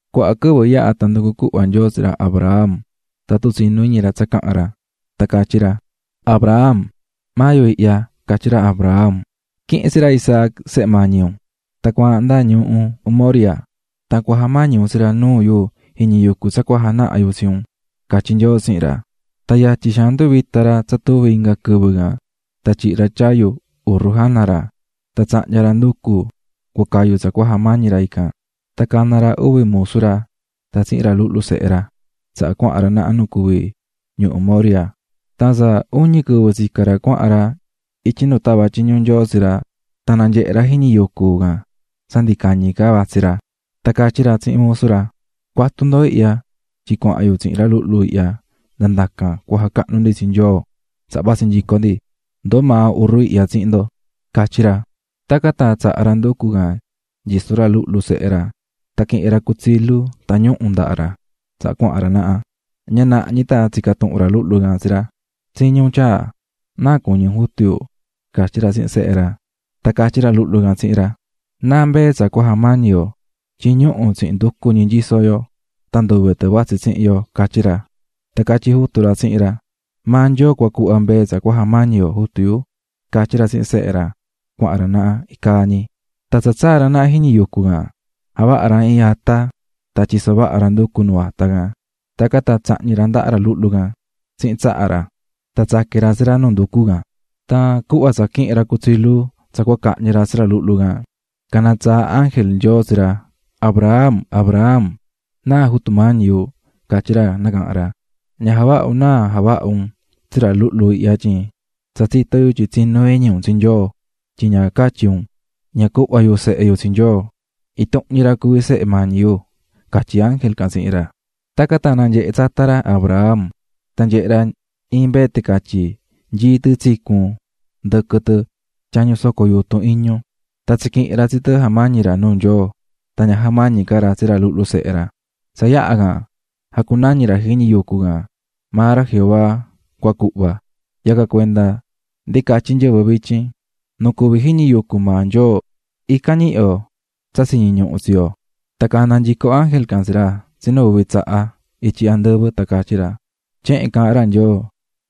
Cuaha quɨvɨ yaha̱ tan nducu̱ cuhva Nyoo tsi ra Abraham tatun tsinú iñi ra tsa caha̱n ra. Tan catyí ra: --Abraham. --Maa yu ihya --catyí ra Abraham. --Qui̱hin tsi ra Isaac, sehe mañi un, cua̱ahan tsihin ra nda ñuhu Moriah, tan ja̱mañi un tsi ra nuu yu jiñi yucu tsa cua janaha yu tsi un -catyí Nyoo tsihin ra. Tan yatyi xaan nduvita̱ ra tsa tuvi inga quɨvɨ can tan tyihi̱ ra tyayu urru jana ra, tan tsahnya̱ ra nducu cua cayu tsa cua jamañi ra, cana̱ ra uvi musu ra tan cana̱ ndɨhɨ ra tsi ra luhlu sehe ra. Tsaha cuahan ra naha nu cuví ñuhu Moriah. Tan tsa uñi quɨvɨ tsicá ra cuahan ra ityi nu tava̱ tyiñu Nyoo tsi ra, tan nanyehe̱ ra jiñi yucu can tsa ndi cañi ca vatsí ra. Tan catyí ra tsihin musu ra: --Cu̱atu ndo ihya tyin cuahan yu tsihin ra luhlu ihya nda ndacan cua jacahnu ndi tsi Nyoo, tsaha vatsi nyico ndi. Ndoo maa urru ihya tsihin ndo --catyí ra. Tacan tan tsaha̱ ra nducu can nyisó ra luhlu sehe ra, tan quihi̱n ra cutsilu tan ñuhu̱ ndahá ra, tsaha cuahan ra naha. Ña naha ñi tan tsica̱ tuhun ra luhlu can tsi ra: --Tsiñí un, tyaa. --¿Náa cuñí un, jutu yu? --catyí ra tsihin sehe ra. Tan catyí ra luhlu can tsihin ra: --¿Náa mbee tsa cua jamañi yo? tyin ñuhu̱ tsihin nducu ñi nyisó yo tan nduve mbee vatsí tsihin yo --catyí ra. Tan catyí jutu ra tsihin ra: --Maa Nyoo cua cuhva mbee tsa cua jamañi yo, jutu yu --catyí ra tsihin sehe ra, cuahan ra naha icaa ñi. Tan tsa tsaa̱ ra naha jiñi yucu can, javaha̱ ra iin ata tan tyiso̱ vaha ra nducu nuu ata can. Tacan tan tsahñi̱ ra ndaha ra luhlu can tsihin tsaha ra, tan tsaqui̱n ra tsi ra nuu nducu can. Tan cuhva tsa quihi̱n ra cutsilu tsa cua cahñi ra tsi ra luhlu can, cana̱ tsaa ángel Nyoo tsi ra: --¡Abraham, Abraham! --Náa, Jutu mañi yu --catyí ra nacaha̱n ra. --Ña ja̱vaha un náa javaha un tsi ra luhlu can tyin tsa tsitó yu tyin tsinú iñi un tsi Nyoo, tyin ña catyi̱ un: "Ña cuhva yu sehe yu tsi Nyoo, intuhun ñi ra cuví sehe mañi yu" ―catyí ángel can tsihin ra. Tacan tan nanyehe̱ tsata ra Abraham, tan nyehe̱ ra iin mbee ticatyi nyií tɨ tsicu̱n ndɨquɨ tɨ tyañu soco yutun iñu, tan tsiquihi̱n ra tsi tɨ jamañi̱ ra nuu Nyoo, tan ña jamañi̱ ca ra tsi ra luhlu sehe ra. Tsa yaha can jacunañi̱ ra jiñi yucu can: "Maa ra Jehová cua cuhva." Yacan cuenda ndi catyí nyɨvɨ vityin: "Nu cuví jiñi yucu maa Nyoo, ican ñihí yo tsa tsiñi ñuhu tsi yo." Tan nacaha̱n nyico ángel can tsihin ra ityi andɨvɨ tsinu uvi tsaha, tan catyí ra: --Tyehen caahán ra Nyoo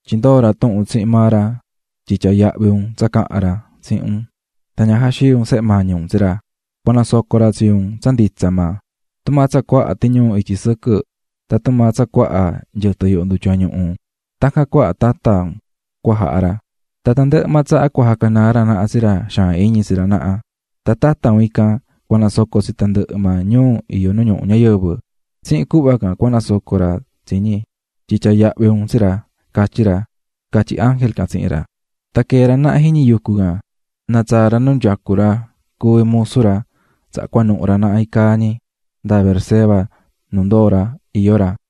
tyin ndoo̱ ra tuhun tsihin maa ra tyin tyaa̱ yahvi un tsa caha̱n ra tsihin un tan ña jaxii̱ un sehe mañi un tsi ra, cua nasoco ra tsi un tsa nditsa maa. Tumaa tsa cuaha tiñuu ityi sɨquɨ tan tumaa tsa cuaha nyɨtɨ yuhu ndutya ñuhu, tacan cuaha tata un cua jaha ra. Tan tandɨhɨ maa tsaha cua jacanaa ra naha tsi ra xaan iñi tsi ra naha. Tan tata un ican cua nasoco tsi tandɨhɨ maa ñuu iyó nu ñuhu ñayɨvɨ, tsihin cuhva can cua nasoco ra tsi ñi, tyin tyaa̱ yahvi un tsi ra, catyí ra --catyí ángel can tsihin ra. Tan quita̱ ra naha jiñi yucu can, tan natsaa̱ nyico ra nu yucú ra cuví musu ra, tacan tan cuanuhu̱ ra naha iin caa ñi nda Beerseba nu ndoo̱ ra iyó ra.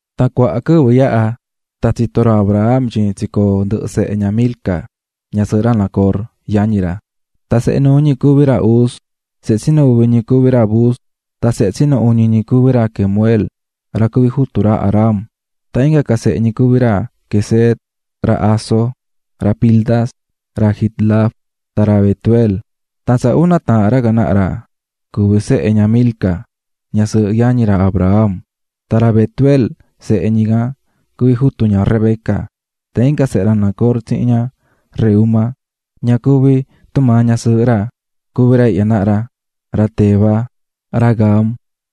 Tan cuaha quɨvɨ yaha, tan tsito̱ ra Abraham tyin tsicoo̱ ndɨhɨ sehe ña Milca ñasɨɨhɨ ra Nacor, yañi ra. Tan sehe nuu ñi cuví ra Uz, sehe tsinu uvi ñi cuví ra Buz, tan sehe tsinu uñi ñi cuví ra Kemuel, ra cuví jutu ra Aram. Tan inga ca sehe ñi cuví ra Quesed, ra Hazo, ra Pildas, ra Jidlaf tan ra Betuel. Tan tsa una taahan ra can naha ra cuví sehe ña Milca ñasɨɨhɨ yañi ra Abraham. Tan ra Betuel sehe ñi can cuví jutu ña Rebeca. Tan inga sehe ra Nacor tsihin ña Reúma, ña cuví tumaa ñasɨɨhɨ ra, cuví ra ihya naha ra: ra Teba, ra Gaham,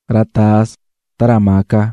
ra Tahas tan ra Maaca.